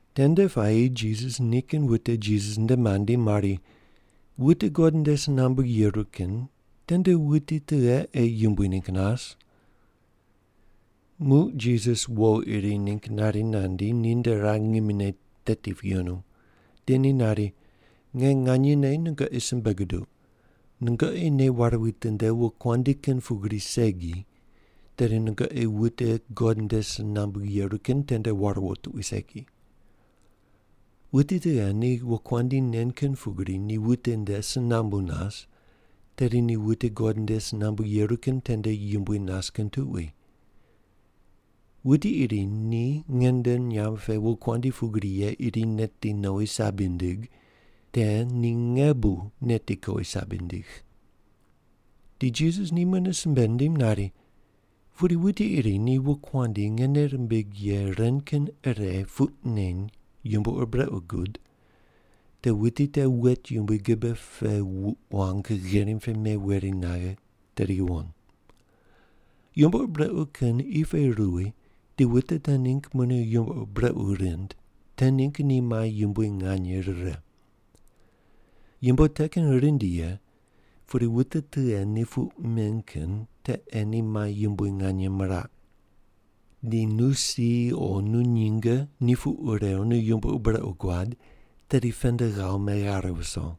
Tende puayi Jisas nikin wute Jisas nde mandi mari, “Wute God nde si nambu yeru kin tende wuti tughe ei yumbui ningg nas?” Muq Jisas wo iri ningg nari nandi, ninde rar ngimine teti pu yenu, di ni nari, “Nge nganyene nungoqi simbe guduq, nungoqi nei ware witinde wokuandi kin pugri segi, tedi nungoqi wute God nde si nambu yeru kin tende war wo tuqui segi. Wuti tughe ni wokuandi nen kin pugri ni wute nde si nambu nas, tedi ni wute God nde si nambu yeru kin tende yumbui nas kin tuqui. Wuti iri ni nge nde nyamb pe wokuandi pugri ye iri neti nowi sabi nindig, te ni nge bu neti kowi sabi nindigh.” Di Jisas ni mune simbe nindim nari, “Pudi wuti iri ni wokuandi nge nei rimbigh ye ren kin ire puq neny yumbo ur brequ gud, te wuti te wet yumbui gibe pe wuq wang gherim pe meweri naghe tedi yuwon. Yumbo ur brequ kin qi pe ruwi di wute te ningg mune yumbo ur brequ rind te ningg ni mai yumbui nganye rire. Yumbo te kin rindi ye, pudi wute tughe ni puq men kin te ei ni mai yumbui nganye miraq. Di nu si o nu nyinge ni puq rew nu yumbo ur brequ guad, tedi pend ghawo meghare viso.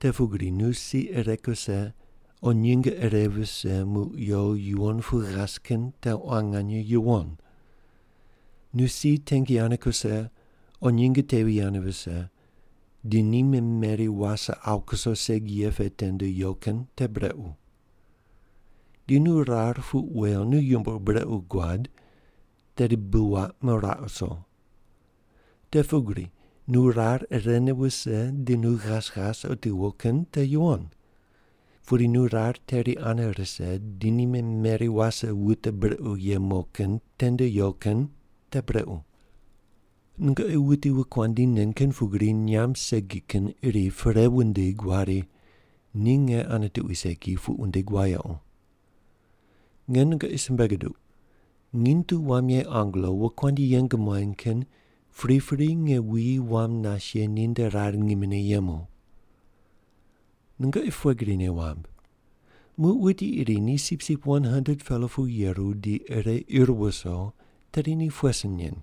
Te pugri nu si ire kuse o nyinge ire vise muq yo yuwon pu ghas kin te quan nganye yuwon. Nu si tengi ane kuse o nyinge tevi ane vise, di ni memeri wase awu kuso segi ye pe tende yo kin te brequ. Di nu rar puq wew nu yumbo ur brequ guad, tedi bi waq meraq wuso. Te pugri nu rar irene wuse di nu ghas ghas otiwo kin te yuwon. Pudi nu rar teri ane rise di ni memeri wase wute brequ ye mo kin tende yo kin te brequ.” “Nungoqi wuti wokuandi nen kin pugri nyamb segi kin iri perei wundig wari, ‘Ni nge ane tuqui segi’ puq wundig wayequ. Nge nungoqi simbe guduq, nginy tu wam ye angelo wokuandi yeng muany kin pripri nge wuyi wam nas ye ninde rar ngimine yemu. “Nungoqi pughe gri nei wamb? Muq wuti iri ni sipsip 100-pela pu yeru di ire ir wuso, tedi ni pughe sin nen?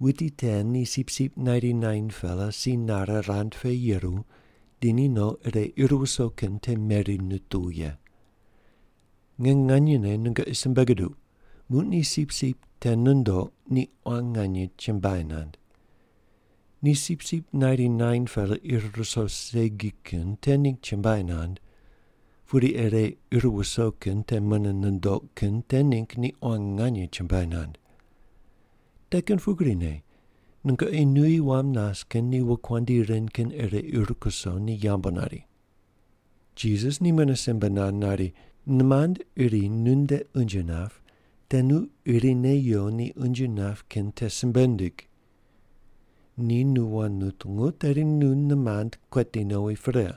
Wuti te ni sipsip 99-pela si nare rand pe yeru di ni no ire ir wuso kin te meri nituw ye. Nge nganyene nungoqi simbe guduq, muq ni sipsip te nundoq, ni quan nganye chumbuai nand. Ni sipsip 99-pela ir ruso segi kin te ningg chumbuai nand, pudi ire ir wuso kin mune nundoq kin te ningg ni quan nganye chumbuai nand. Te kin pugrine nungoqi nuyi wam nas kin ni wokuandi ren kin ire ir kuso ni yambu nari.” Jisas ni mune simbe nand nari, “Nimand iri nunde unje nap, te nu irine yo ni unje nap kin te simbe ndig. Ni nu wand nutungu, tedi nu nimand kueti nowi pre.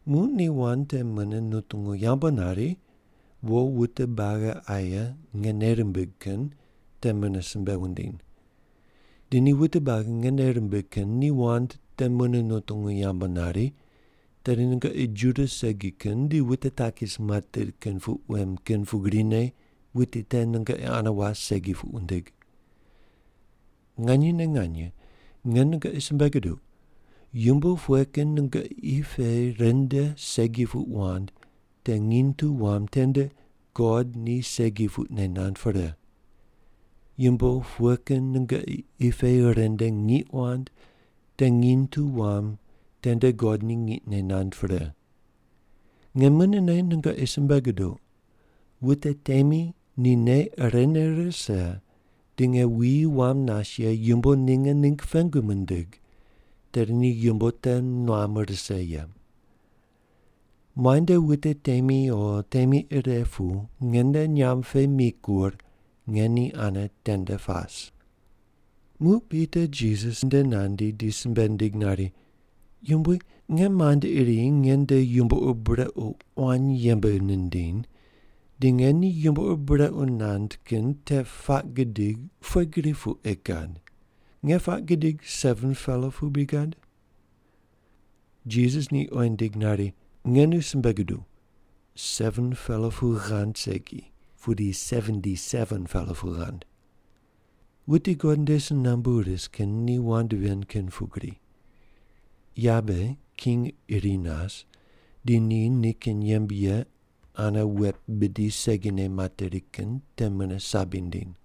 Muq ni wand te mune nutungu yambu nari, wo wute buagi aye nge nei rimbigh kin te mune simbe wundiny. Di ni wute buagi nge nei rimbigh kin ni wand te mune nutungu yambu nari, tedi nungoqi Juda segi kin di wute takis materi kin puq wem kin pugrine wuti te nungoqi ane was segi puq wundig. “Nganyene nganye, nge nungoqi simbe guduq, yumbo pughe kin nungoqi qi pe ren nde segi puq wand te nginy tu wam tende God ni segi puqne nand pre. Yumbo pughe kin nungoqi qi pe ren nde ngiq wand te nginy tu wam tende God ni ngiqne nand pre. Nge munene nungoqi simbe guduq, wute temi ni nei irene rise di nge wuyi wam nas ye yumbo ninge ningg pengu mindig, tedi ni yumbo te nuam rise ye. Muainde wute temi o temi ire pu nge nde nyamb pe mikur, nge ni ane tende pas.” Muq Pita Jisas nde nandi di simbe nindig nari, “Yumbui, nge mand iri nge nde yumbo ur brequ quan yembe nindiny, di nge ni yumbo ur brequ nand kin te puaq gidig pughe gri pu ei gad? Nge puaq gidig 7-pela pu bri gad?” Jisas ni oyi nindig nari, “Nge nu simbe guduw, 7-pela pu ghand segi, pudi 77-pela pu ghand. Wute God nde si nambu ris kin ni wand ven kin pugri. Yabe king iri nas di ni nikin yembe ye ane wet bidi segine materi kin te mune sabi nindiny.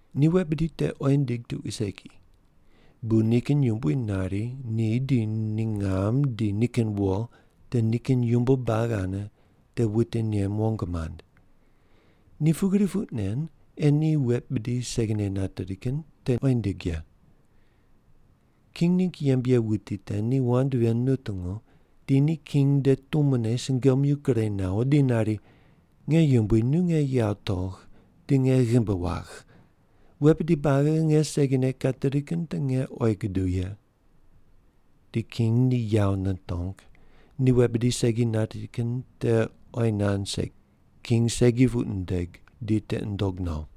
Ni wet bidi te oyi nindig tuqui segi, bu nikin yumbui nari ni di ni ngam di nikin wo di nikin yumbo buagi ane te wute nem wong mand. Ni pugri puq nen ei ni wet bidi segine nateri kin te oyi nindig ye. King ningg yembe ye wuti te ni wand ven nutungu, di ni king nde tumone sungomyu gure nawo di nari, ‘Nge yumbui, nu nge yawo togh di nge ghimbi wagh. Wet bidi buagi nge segine kateri kin te nge oyi guduw ye.’ Di king ni yawo nitong, ni wet bidi segi nateri kin te oyi nand segi, king segi puq nindig di tiqi nundog no.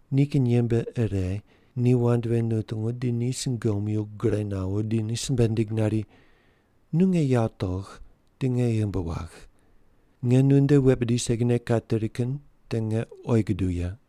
Nikin yembe ire ni wand ven nutungu di ni sungomyu gure nawo di ni simbe nindig nari, ‘Nu nge yawo togh di nge ghimbi wagh. Nge nunde wet bidi segine kateri kin te nge oyi guduw ye.’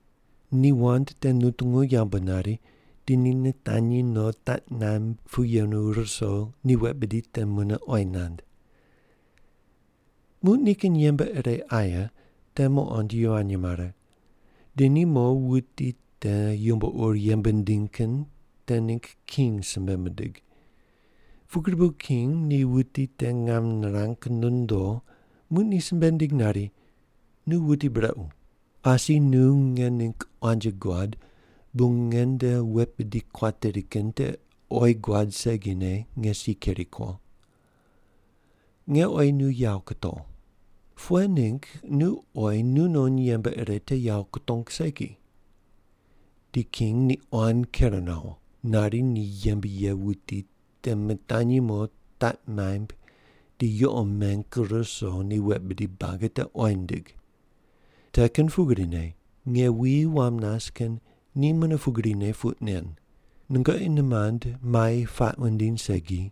Ni wand te nutungu yambu nari, di ni nitanyi no taq naimb pu yenu ruso ni wet bidi te mune oyi nand. Muq nikin yembe ire aye te muqond yivany mare, di ni mo wuti te yumbo ur yembe nindiny kin te ningg king simbe mindig. Pugri bu king ni wuti te ngam nirang nondo, muq ni simbe nindig nari, ‘Nu wuti brequ. Asi nu nge ningg quanji guad bu nge nde wet bidi kuateri kin te oyi guad segine nge si keri ko. Nge oyi nu yawo kutow. Pughe ningg nu oyi nu non yembe ire te yawo kutong segi?’ Di king ni quan ker nawo, nari ni yembe ye wuti te mitanyi mo taq maimb di yuqo meng ruso ni wet bidi buagi te oyi nindig. Te kin pugrine nge wuyi wam nas kin ni mune pugrine puq nen, nungoqi nimand mai puaq wundiny segi,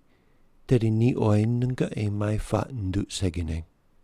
tedi ni oyi nungoqi mai puaq nunduq segine.”